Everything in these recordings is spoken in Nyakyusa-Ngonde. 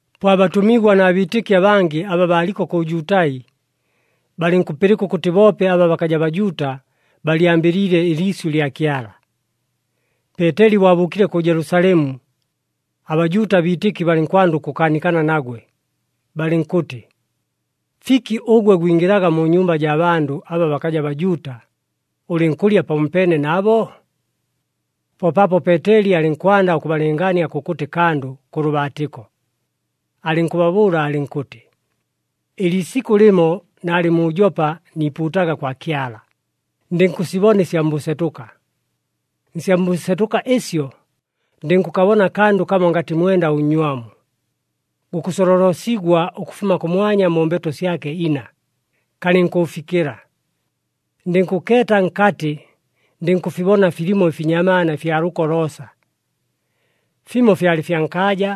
Po abatʉmigwa na biitɨki abangɨ aba baaliko kʉ Jutai, balɨnkʉpɨlɨka ʉkʉtɨ boope aba bakaja Bajuuta balyambɨliile ɨliisyʉ lya Kyala. Peeteli bo abʉʉkile kʉ Jelusalemu, aBajuuta abiitɨki balɨnkwanda ʉkʉkaanikana nagwe, balɨnkʉtɨ, “Fiki ʉgwe gwingɨlaga mu nyumba jaa bandʉ aba bakaja Bajuuta, ʉlɨnkʉlya pamopeene nabo?” Po paapo Peeteli alɨnkwanda ʉkʉbalɨngaania kʉkʉtɨ kandʉ kʉ lʉbaatɨko, alɨnkʉbabʉʉla alɨnkʉtɨ, “Ɨliisikʉ lɨmo naalɨ mu Jopa niipuutaga kwa Kyala, ndɨnkʉsibona ɨsya mbʉsetʉka. Nsya mbʉsetʉka ɨsyo, ndɨnkʉkabona akandʉ kamo ngatɨ mwenda ʉnnywamu, gukʉsololosigwa ʉkʉfuma kʉmwanya mu mbeto syake ina, kalɨnkʉʉfikɨla. Ndɨnkʉkeeta nkatɨ, ndɨnkʉfibona filimo ɨfinyamaana ɨfya lʉko loosa, fimo fyalɨ fya nkaaja,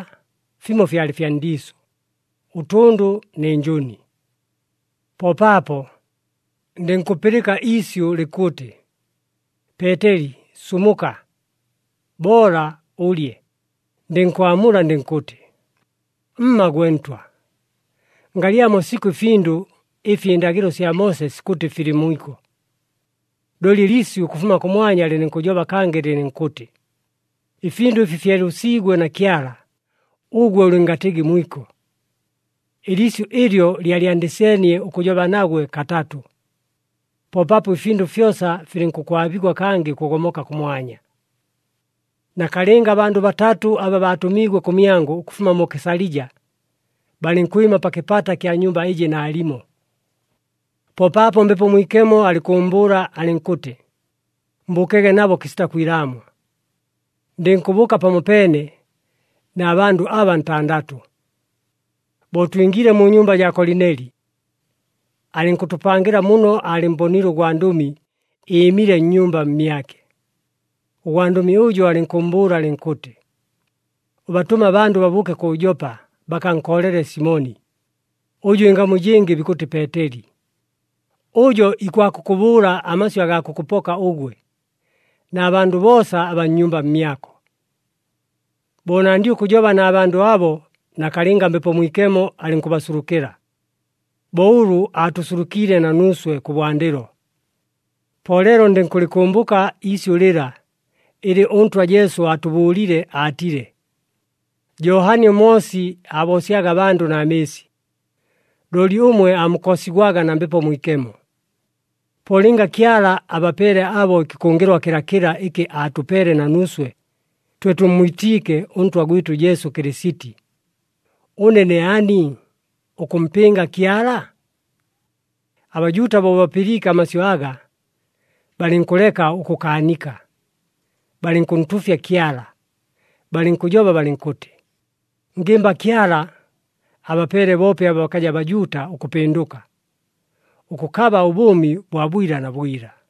fimo fyalɨ fya ndiisʉ, ʉtʉndʉ nɨ njʉni. “Po paapo, ndɨnkʉpɨlɨka iisyʉ likʉtɨ, ‘Peeteli, sumuka! Boola ʉlye!’ Ndɨnkwamula ndɨnkʉtɨ, ‘Mma gwe Ntwa! Ngalyamo sikʉ ɨfindʉ ɨfi ɨndagɨlo sya Moose sikʉtɨ filɨ mwiko.’ Looli ɨliisyʉ ʉkʉfuma kʉmwanya lɨlɨnkʉjoba kangɨ lɨlɨnkʉtɨ, ‘Ɨfindʉ ɨfi fyelʉsiigwe na Kyala, ʉgwe ʉlɨngatɨgɨ mwiko.’ Ɨliisyʉ ɨlyo lyalyandɨseenie ʉkʉjoba nagwe katatʉ, po paapo ɨfindʉ fyosa filɨnkʉkwabigwa kangɨ ʉkʉgomoka kʉmwanya. “Nakalɨnga abandʉ batatʉ, aba baatʉmiigwe kʉmyangʉ ʉkʉfuma mu Kesalija, balɨnkwɨma pa kɨpata kya nyumba ɨjɨ naalimo. Po paapo Mbepo Mwikemo alɨnkʉʉmbʉʉla alɨnkʉtɨ mbʉʉkege nabo kɨsita kwilaamwa. Ndɨnkʉbʉʉka pamopeene na bandʉ aba ntandatʉ. Bo twingiile mu nyumba jaa Kolineli, alɨnkʉtʉpangɨla muno aalɨmmboniile ʉgwandʉmi ɨɨmile nnyumba mmyake. Ʉgwandʉmi ʉjo alɨnkʉmmbʉʉla alɨnkʉtɨ, ‘Ʉbatʉme abandʉ babʉʉke kʉ Jopa, bakankoolele Simoni, ʉjʉ ɨngamu ɨjɨngɨ bikʉtɨ Peeteli. Ʉjo ikwakʉkʉbʉʉla amasyʉ agaa kʉkʉpoka ʉgwe, na bandʉ boosa abaa nnyumba mmyako.’ “Bo nandile ʉkʉjoba na bandʉ abo, nakalɨnga Mbepo Mwikemo alɨnkʉbasulukɨla, bo ʉlʉ aatʉsulukiile na nuuswe kʉbwandɨlo. Po leelo ndɨnkʉlɨkʉmbʉka iisyʉ lɨla, ɨlɨ ʉNtwa Jesu aatʉbʉʉlile aatile, ‘Johani ʉMoosi aaboosyaga abandʉ na mɨɨsi, looli ʉmwe aamukoosigwaga na Mbepo Mwikemo.’ Po lɨnga Kyala abapeele abo ɨkɨkʉngɨlwa kɨlakɨla ɨkɨ aatʉpeele na nuuswe, twe tʉmmwitiike ʉNtwa gwɨtʉ Jesu Kɨlɨsiti, ʉne ne ani ʉkʉmpɨnga Kyala?” ABajuuta bo bapɨliike amasyʉ aga, balɨnkʉleka ʉkʉkaanika, balɨnkʉntuufya Kyala, balɨnkʉjoba balɨnkʉtɨ, “Ngɨmba Kyala abapeele boope aba bakaja Bajuuta ʉkʉpɨndʉka, ʉkʉkaba ʉbʉʉmi bwa bwila na bwila!”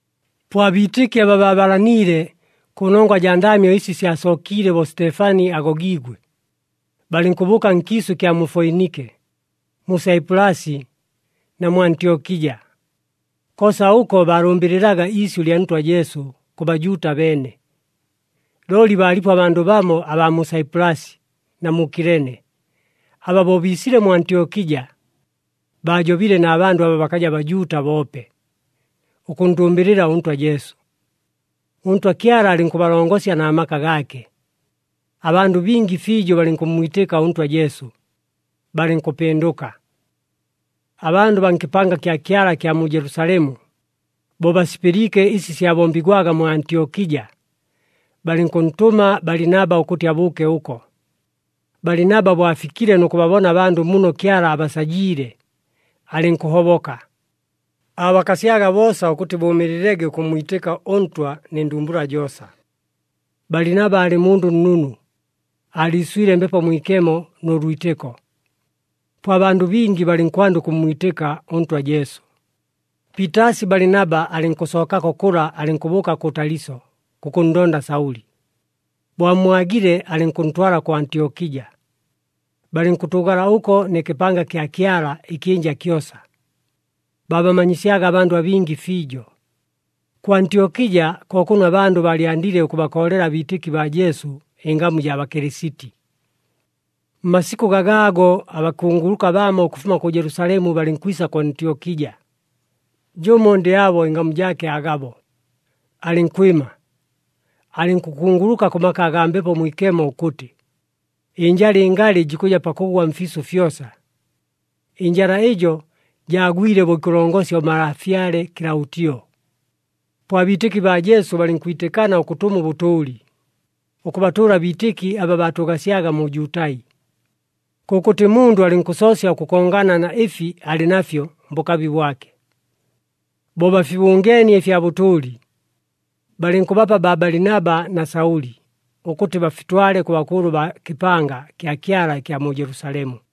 Po abiitɨki aba baabalaniile kʉnongwa jaa ndaamyo ɨsi syasookiile bo Sitefani agogiigwe, balɨnkʉbʉʉka nkiisʉ ɨkya mu Foinike, mu Saipulasi na mu Antyokija. Koosa ʉko baalʉmbɨlɨlaga iisyʉ lya Ntwa Jesu kʉ Bajuuta beene. Looli baalipo abandʉ bamo abaa mu Saipulasi na mu Kilene, aba bo biisile mu Antyokija, baajobile na bandʉ aba bakaja Bajuuta boope, ʉkʉnndʉmbɨlɨla ʉNtwa Jesu. ɄNtwa Kyala alɨnkʉbalongosya na maka gaake, abandʉ bingi fiijo balɨnkʉmmwitɨka ʉNtwa Jesu, balɨnkʉpɨndʉka. Abandʉ baa nkɨpanga kya Kyala kya mu Jelusalemu bo basipɨliike ɨsi syabombigwaga mu Antyokija, balɨnkʉntʉma Balinaba ʉkʉtɨ abʉʉke ʉko. Balinaba bo afikile nʉ kʉbabona abandʉ muno Kyala abasajiile, alɨnkʉhoboka. Aabakasyaga boosa ʉkʉtɨ bʉʉmɨɨlɨlege ʉkʉmmwitɨka ʉNtwa nɨ ndumbula joosa. Balinaba aalɨ mundʉ nnunu, aaliiswile Mbepo Mwikemo nʉ lwitɨko. Po abandʉ bingi balɨnkwanda ʉkʉmmwitɨka ʉNtwa Jesu. Piitaasi Balinaba alɨnkʉsookako kʉla alɨnkʉbʉʉka kʉ Taliso kʉkʉnndonda Saʉli. Bo ammwagile, alɨnkʉntwala kʉ Antyokija. Balɨnkʉtʉʉgala ʉko nɨ kɨpanga kya Kyala ɨkyɨnja kyosa, baabamanyisyaga abandʉ abingi fiijo. Kʉ Antyokija ko kʉno abandʉ baalyandile ʉkʉbakoolela abiitɨki baa Jesu, ɨngamu jaa Bakɨlɨsiti. Mmasikʉ gagaago, abakunguluka bamo ʉkʉfuma kʉ Jelusalemu balɨnkwisa kʉ Antyokija. Jʉmo ndɨ abo ɨngamu jaake Agabo, alɨnkwɨma, alɨnkʉkunguluka kʉ maka agaa Mbepo Mwikemo ʉkʉtɨ, ɨnjala ɨngalɨ jikʉja pakʉgwa mfiisʉ fyosa. Ɨnjala ɨjo jaagwile bo ikʉlongosya ʉmalafyale Kɨlaʉtio. Po abiitɨki baa Jesu balɨnkwitɨkana ʉkʉtʉma ʉbʉtʉʉli, ʉkʉbatʉʉla abiitɨki aba baatʉʉgasyaga mu Jutai. Kʉkʉtɨ mundʉ alɨnkʉsoosya ʉkʉkongana na ɨfi alɨ nafyo mbʉkabi bwake. Bo bafibʉngeenie ɨfya bʉtʉʉli, balɨnkʉbapa baa Balinaba na Saʉli, ʉkʉtɨ bafitwale kʉ bakʉʉlʉ baa kɨpanga kya Kyala ɨkya mu Jelusalemu.